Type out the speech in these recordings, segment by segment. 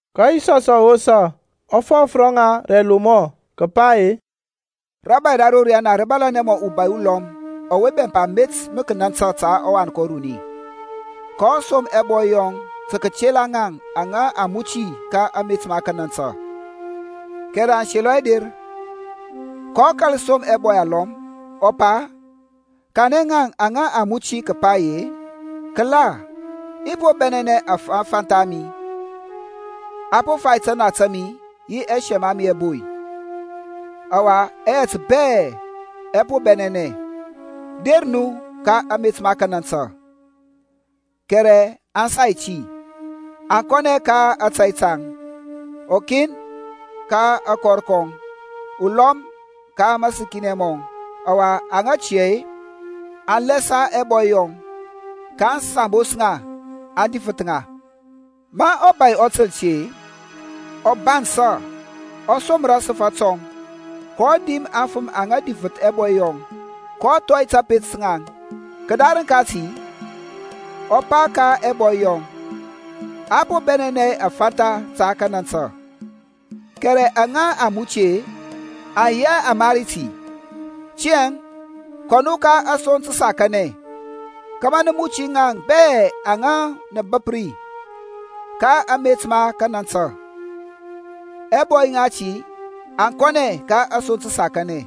Ka Yisɔsȧŋ ɔ wosa, ɔ fɔf ro ŋaŋ rǝ ɛlomɔ, kǝpa ye, Rȧbȧy ra ro riyana rǝ yi mɔ ubȧy ulɔm ɔwe bɛmpa met ma kanantǝ ta ɔwan kɔŋ uruni, kɔ som ɛbɔy yɔŋ tǝ kǝtela ŋaŋ aŋa a muti ka amet ma kanantǝ. Kɛrɛ aŋ selɔ hɛ der. kɔ kȧl som ɛbɔy alɔm, ɔ pa, Kanɛ ŋaŋ aŋa a muti kǝpa ye, Kǝla, i po bɛnɛnɛ aŋfantha a mi. A po fai tana ta mi yi ɛsɛm ɛ mi ɛboy, ɔwa ɛyɛt bɛ ɛ po bɛnɛnɛ. Der nu ka amet ma kanantǝ. Kɛrɛ aŋ sai ti, aŋ kɔnɛ ka ȧtȧy taŋ, ukin ka akɔr kɔŋ, ulɔm ka mȧsǝkinɛ mɔŋ. Ɔwa aŋa tia-e, aŋ lɛsa ɛbɔy yɔŋ, kaŋ sambos ŋa, aŋ difǝth ŋa. Ma ɔbȧy ɔ tǝl ti-e, ɔ bansȧ, ɔ somra asǝfȧ tɔŋ, kɔ dim aŋfǝm aŋa difǝth ɛbɔy yɔŋ, kɔ thɔi kȧpet ka ŋaŋ. Kǝdarǝŋ kati ɔ pa ka ɛbɔy yɔŋ. A po bɛnɛnɛ aŋfantha ta kanantǝ, kɛrɛ aŋa a muti-e, aŋ yi hɛ amari ti. Tiyȧŋ kɔ nu ka asoŋ tǝsakanɛ kȧmȧ nǝ muti ŋaŋ bɛ aŋa mǝ nǝ bǝp ri ka amet ma kanantǝ. Ɛbɔy ŋati aŋ kɔnɛ ka asoŋ tǝsakanɛ,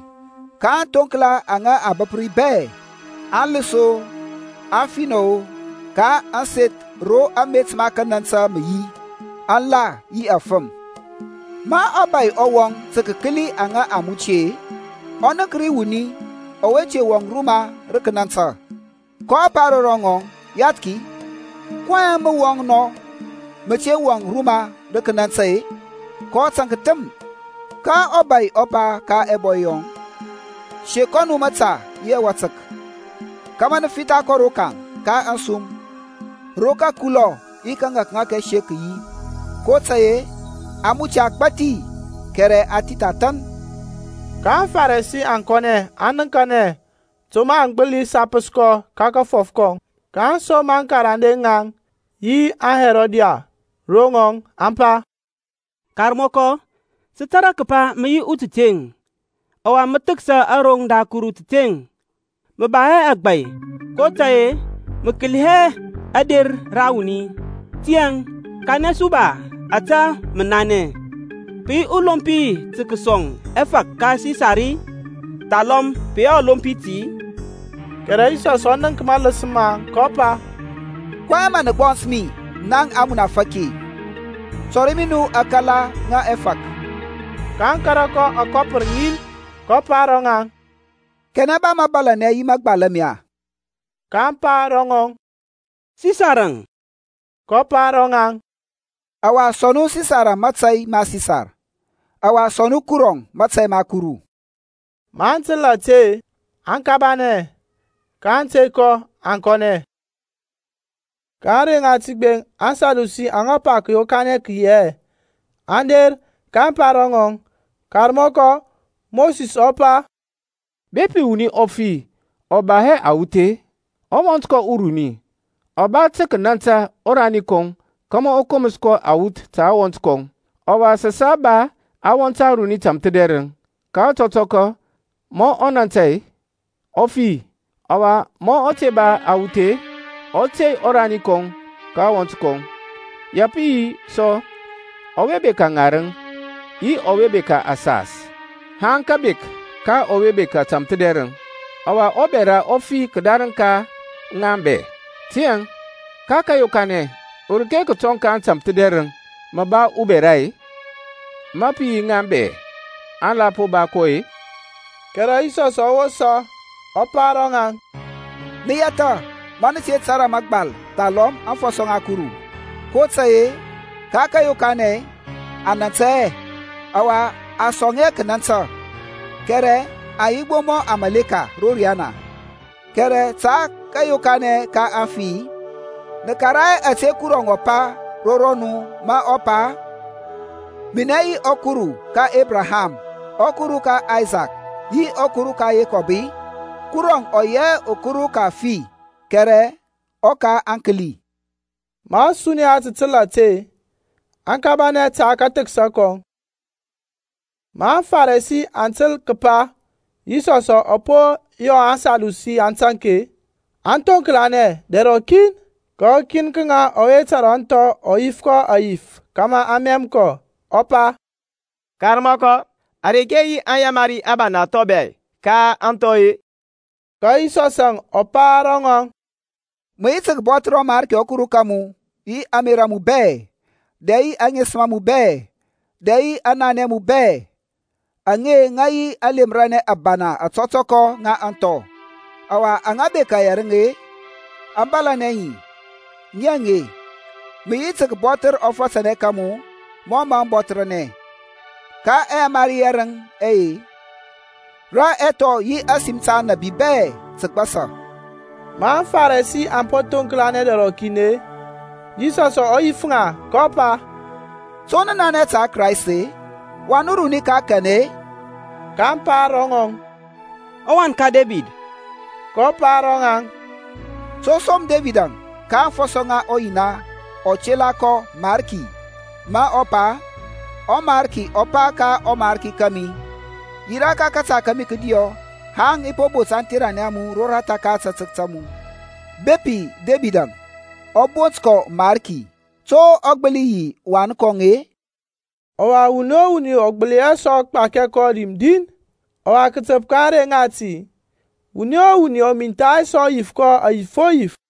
kaŋ thoŋkla aŋa aŋ bǝp ri bɛ, aŋlǝs-o, aŋfinɔ-o; ka ȧŋseth ro amet ma kanantǝ mǝ yi aŋ la yi afǝm. Ma ɔbȧy ɔ wɔŋ tǝ kǝkǝli aŋa a muti-e, ɔ nənk ri wuni ɔwe te wɔŋ ruma ra kanantǝ. kɔ pa ro ŋɔŋ, Yathki, kɔyɛŋ mǝ mǝ wɔŋ nɔ, mǝ te wɔŋ ruma ra kȧnȧntȧ-e? kɔ taŋk thǝm. Ka ɔbȧy ɔ pa ka ɛbɔy yɔŋ, Sek kɔ nu mȧta yi ȧtȧtək, kȧmȧ nǝ fitha kɔ rokaŋ ka ȧŋsum, ro kǝkulɔ yi kǝŋȧkŋȧk ɛsek kǝ yi. kotȧy-e a muti agbȧthi kɛrɛ a thith athȧn. Ka aŋFarisi aŋ kɔnɛ aŋ nǝŋkanɛ to mǝ aŋ gbǝli sapǝs kɔ ka kafɔf kɔŋ. kaŋ som aŋkarande ŋaŋ yi aŋHerodian ro ŋɔŋ, aŋ pa, Karmɔkɔ sǝ tȧrȧ kǝpa mǝ yi utǝteŋ, ɔwa mǝ thǝksa aroŋ da Kuru tǝteŋ. Mǝ ba hɛ agbȧy kotȧy-e mǝ kǝli hɛ ȧder ra wuni. Tiyȧŋ kanɛ su ba ȧte mǝ nanɛ. Pǝ yi ɔlompi tǝ kǝsɔŋ ɛfȧk ka Sisar-i, thalɔm pǝ lomp hɛ ti-i? Kɛrɛ Yisɔsȧŋ ɔ nənk mȧlǝs maŋ, kɔ pa, kɔyɛŋ mǝ nǝ gbɔns mi naŋ amunafaki-i? Tɔri mi nu aŋkala ŋa ɛfȧk. Kaŋ kȧrȧ kɔ akɔpǝr ŋin. kɔ pa ro ŋaŋ, Kanɛ ba mȧbȧlȧnɛ yi mȧgbal ame-e? kaŋ pa ro ŋɔŋ, Sisarȧŋ. Kɔ pa ro ŋaŋ, Ɔwa sɔŋ nu Sisarȧŋ mȧtȧy ma Sisar, ɔwa sɔŋ nu Kuru mȧtȧy ma Kuru. Maŋ tǝl ȧte-e, aŋ kabanɛ, kaŋ tey kɔ, aŋ kɔnɛ. Ka ȧŋrey ŋati gbeŋ, aŋSadusi aŋa pa kǝyokanɛ kǝ yi hɛ, aŋ der, kaŋ pa ro ŋɔŋ, Karmɔkɔ, Mosis ɔ pa, Bepi wuni ɔ fi ɔ ba hɛ awuth-e, ɔwɔnt kɔŋ uruni ɔ ba tǝ kǝnantǝ ɔrani kɔŋ kȧmȧ ɔ komǝs awuth ta ɔwɔnt kɔŋ. Ɔwa sǝ sa ba awɔnt aruni tamthǝdɛrǝŋ. Ka ɔtɔtɔkɔ ma ɔ nȧntȧ-e, ɔ fi, ɔwa ma ɔ te ba awuth-e, ɔ tey ɔrani kɔŋ ka ɔwɔnt kɔŋ. Ya pǝ yi sɔ ɔwe bekȧ ŋarǝŋ, yi ɔwe bekȧ asas, haŋ kǝbek ka ɔwe bekȧ tamthǝdɛrǝŋ. Ɔwa ɔbɛra ɔ fi kǝdarǝŋ ka ŋaŋ bɛ. Tiyȧŋ, ka kȧyokanɛ, ureke kǝtɔŋ ka aŋtamthǝdɛrǝŋ mǝ ba ɔbɛra-e, ma pǝ yi ŋaŋ bɛ aŋ la po ba kɔ-e? Kɛrɛ Yisɔsȧŋ ɔ wosa ɔ pa ro ŋaŋ, Nǝ yɛthȧ ma nǝ te tȧrȧ mȧgbal thalɔm aŋfɔsɔ ŋa Kuru. kotȧy-e ka kȧyokanɛ aŋ nȧntȧ hɛ, ɔwa a sɔŋ hɛ kǝnantǝ, kɛrɛ aŋ yi gbo mɔ aŋmȧleka ro riyana. Kɛrɛ ta kȧyokanɛ ka aŋfi-e, nǝ karaŋ hɛ ȧte Kuru ɔ pa ro nu mǝ ɔ pa, Minɛ yi ɔKuru ka Ebraham, ɔKuru ka Aysak yi ɔKuru ka Yekɔb-i? Kuruȧŋ ɔ yi hɛ ɔKuru ka aŋfi kɛrɛ ɔka aŋkǝli. Ma ȧsuniya tǝ tǝl ȧte-e, aŋ kabanɛ ta kathǝksa kɔŋ. Ma aŋFarisi aŋ tǝl kǝpa Yisɔsȧŋ ɔ po yɔ aŋSadusi aŋ taŋk-e, aŋ thoŋklanɛ dɛr rɔkin. Ka ukin ka ŋaŋ ɔwe tȧrȧ aŋthɔ ɔ yif kɔ ȧyif kȧmȧ ɔ mɛm kɔ, ɔ pa, Karmɔkɔ, areke yi aŋyamari ȧbana thɔŋ bɛ ka aŋthɔ-e? Ka Yisɔsȧŋ ɔ pa ro ŋɔŋ, Mǝ yi tǝ kǝbɔthǝr ɔMarki ɔKuru ka mu yi ȧŋmerȧ a mu bɛ, dɛ yi aŋesǝm a mu bɛ, dɛ yi ananɛ a mu bɛ. Aŋe, ŋǝ yi aŋyamari ȧbana ȧtɔtɔkɔ ŋa aŋthɔ. Ɔwa, aŋa bekȧ yɛrǝŋ-e aŋ bȧlȧnɛ ŋi, ŋi aŋe, Mǝ yi tǝ kǝbɔthǝr ɔfatanɛ ka mu mɔ mǝ mǝ bɔthǝrnɛ. Ka ɛyamari yɛrǝŋ ɛye rǝ aŋthɔ yi ȧsim ta aŋnabi bɛ tǝ gbasa. Ma aŋFarisi aŋ po thoŋklanɛ dɛr rɔkin-e, Yisɔs ɔ yif ŋa, kɔ pa, To nǝ nanɛ ta Kraist-e? Wan uruni ka kanɛ-e? kaŋ pa ro ŋɔŋ, Ɔwan ka Debid. kɔ pa ro ŋaŋ, To som Debidȧŋ, ka aŋfɔsɔ ŋa ɔYina ɔ tela kɔ Mariki ma ɔ pa, ƆMariki ɔ pa ka ɔmarki kȧmi, Yirȧ ka kȧta kȧmi kǝdiyɔ Haŋ i bot aŋtheranɛ a mu roratha ka ȧtȧtək ta mu-e? Bepi Debidȧŋ ɔ bont kɔ Mariki, to ɔ gbǝli yi ɔwan kɔŋ-e? Ɔwa wuni o wuni ɔ gbǝli hɛ sɔ gbakia kɔ dim din. Ɔwa kǝtǝp ka ȧŋrey ŋati wuni o wuni ɔ mintha hɛ sɔ yif kɔ ȧyif o yif.